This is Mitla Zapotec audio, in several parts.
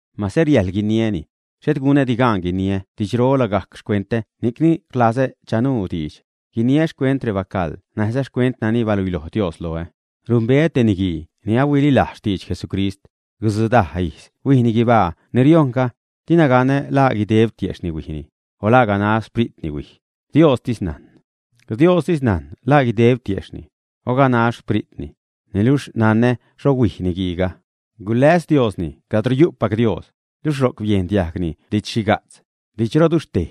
Mase riäjḻ guiniäni, xhet gunädi gaan guiniä didxro lagajc xcuentä ni'cni rlazä chanuu diidx, guiniä xcuent rebacaḻ näjza xcuent nani baluiloj Dios loä. Numbeä te niguii ni ahuililajz xtidx Jesucrist. Gutzudaj ijz huijni guibaa ni riojṉga, dina ganä laa guideb tiejxhni huijni, o la ganax xspritni huij, Diostis najn. Diostis najn la guideb tiejxhni, o ganax xpritni, niluxh nanä xho huij niguiiga, guläs Diosni cadro yu'pac Dios, luxh ro'c biejn diajgni didx-xhiga'tz, didxroduxhtej,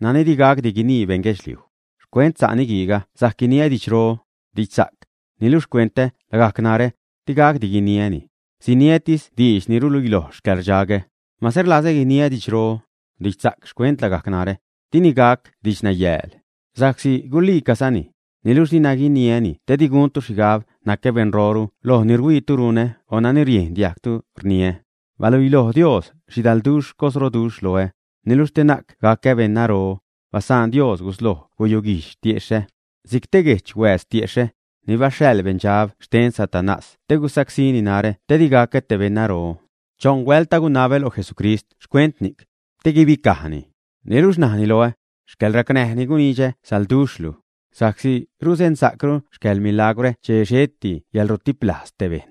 nani di gacdi guinii beṉ guedxliuj. Xcuent sa' niguiiga sajc guiniä didxro, didxsa'c, niluxh xcuent lagajc narä, di gacdi guiniäni; siniätis diidx ni ruluiloj xcäḻrdxagä. Mase rlazä guiniä didxro, didxsa'c xcuent lagajc narä, dini gac didxnayääl, sa'csi guliicazani. Niluxh dina guiniäni te di guntu xhigab nacä beṉroru loj ni rhuiitu runä o nani riejn diajgtu rniä. Baluiloj Dios xhidalduxh cosroduxh loä, niluxh te na'c gacä beṉnaro, basaan Dios gusloj guyuguijdx tiexhä, si'c te guejch huääz tiexhä, ni baxhaḻ beṉdxab xten Satanás te gusacsíni narä te di gacä te beṉnaro. Choṉ huält agunabä lo Jesucrist xcuent ni'c, te guibicajni. Niluxh laani najni loä: “Yäḻracnäj ni gunidxä salduxh luj, sa'csi ruzeṉsa'cru xcäḻmilagwrä che xheti yälrutiplajz te bejṉ.”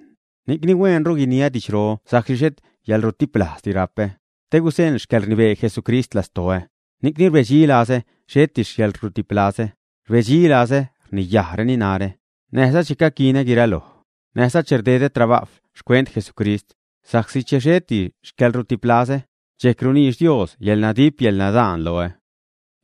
Ni'cni hueenru guiniä didxro sa'csi xhet yäḻrutiplazädi rapä, te guzeṉ xcäḻrnibee Jesucrist lastoä. Ni'cni rbedxilazä xheti xcäḻrutiplazä, rbedxizalazä rniyajreni narä, näjza che caquinä guiraloj, näjza che rdedä trabajw xcuent Jesucrist, sa'csi che xheti xcäḻrutiplazä, dxejc runiidx Dios yäḻnadip, yäḻnadaan loä.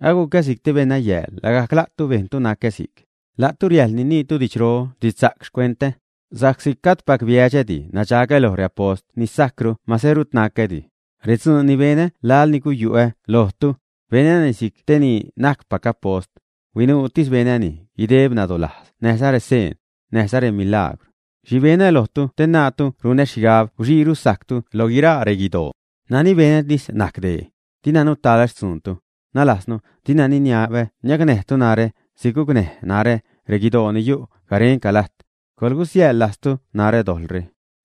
Agucä si'c te beṉnayääl, lagajc la'tu bejntu nacä si'c. La'tu riäjḻ niniitu didxro, didxsa'c xcuentä, sa'csi gajdpac biädxädi, nadxagä loj reapost ni sajcru mase rut nacädi. Redzuun ni benä laḻ ni guyu'ä lojtu, benäni si'c te ni najcpac apost, huinuutis benäni guideb nadolajz näjza reseen, näjza remilagwr. ¿Xhi benä lojtu te naatu runä xhigab guxiiru sajctu loj guiraa reguidoo? Nani benätis najc dee: dina nutaḻä xtzuuntu, nalajznu dina niniabä niacnäjtu narä si'c gucnäj narä reguidoo ni yu' garenca lajt. ¡Coḻsiäjḻ lajztu narä dojḻre!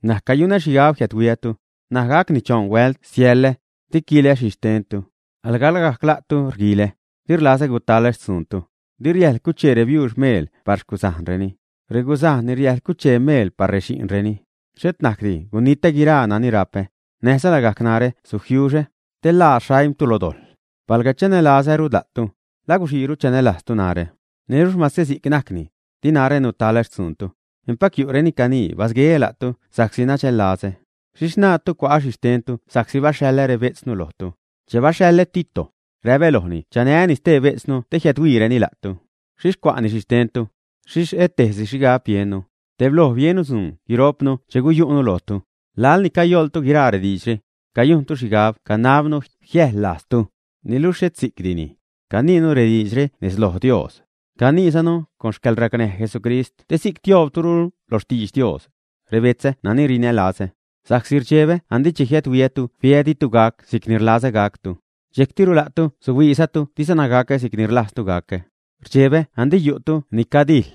N̲aj cayunä xhigab jiädhuiätu, ṉaj gacni choṉ huält siälä. Di quilä xhixtentu, alga lagajc la'tu rguilä. Di rlazä gutalä xtzuuntu. Di riäjl cuchee rebiuux meel par xcuzajnreni. Reguzajn ni riäjl cuchee meel par rexi'nreni. Xhet najcdi gunitä guiraa nani rapä, näjza lagajc narä sujiuxä, te ḻaa xaimtu lo dojḻ. Palga chanälazäru la'tu, ¿la guxiiru chanälajztu narä, ä? Niluxh mase si'c najcni, di narä nutalä xtzuuntu. Empac yu'reni canii basgueä la'tu sa'csi nadxällazä. ¿Xhixh naatu cua'ä xhi xtentu sa'csi baxhaḻä rebejtznu lojtu, ä? Che baxhaḻä Tito, räpä lojni chanääni stee bejtznu te jiädhuiireni la'tu. ¿Xhixh cua'ni xhi xtentu, ä? Xhixh et tejsi xhigab biennu, tebloj biennu dzuun guiro'pnu che guyu'nu lojtu. Laḻni cayoḻtu guiraa rediidxre, cayujntu xhigab canabnu jiäjḻ lajztu, niluxh xhet si'cdini. Caniinu rediidxre nez loj Dios, caniizanu con xcäḻracnäj Jesucrist te si'c tioobrutu lo xtidx Dios, rebetzä nani rinälazä. Sa'csi rdxebä andi che jiädhuiätu fiä ditu gac si'cni rlazä gactu, dxejctiru la'tu suhuiizatu dizana gacä si'cni rlajztu gacä. Rdxebä andi yu'tu ni cadijḻ,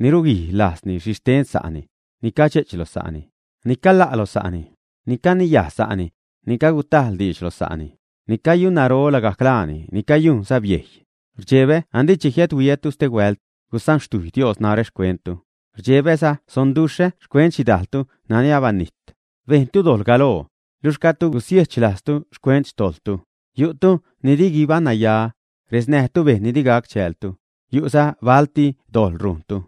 ni ruguij lajzni xhixten sa'ni, ni cadxe'ch lo sa'ni, ni cala' lo sa'ni, ni caniyaj sa'ni, ni cagutajḻ diidx lo sa'ni; ni cayunnaro lagajc laani, ni cayujnza biejy. Rdxebä andi che jiädhuiätu stehuält, gusanxtujy Dios narä xcuenttu. Rdxebäza sonduxhä xcuent xhidajltu nani abanijt, bejntu dojḻ galoo, luxh gajdtu gusiechlajztu xcuent xtojḻtu. Yu'tu ni di guibaṉnaya, resnäjtu bejṉ ni di gac chäältu, yu'za balti dojḻ rujntu.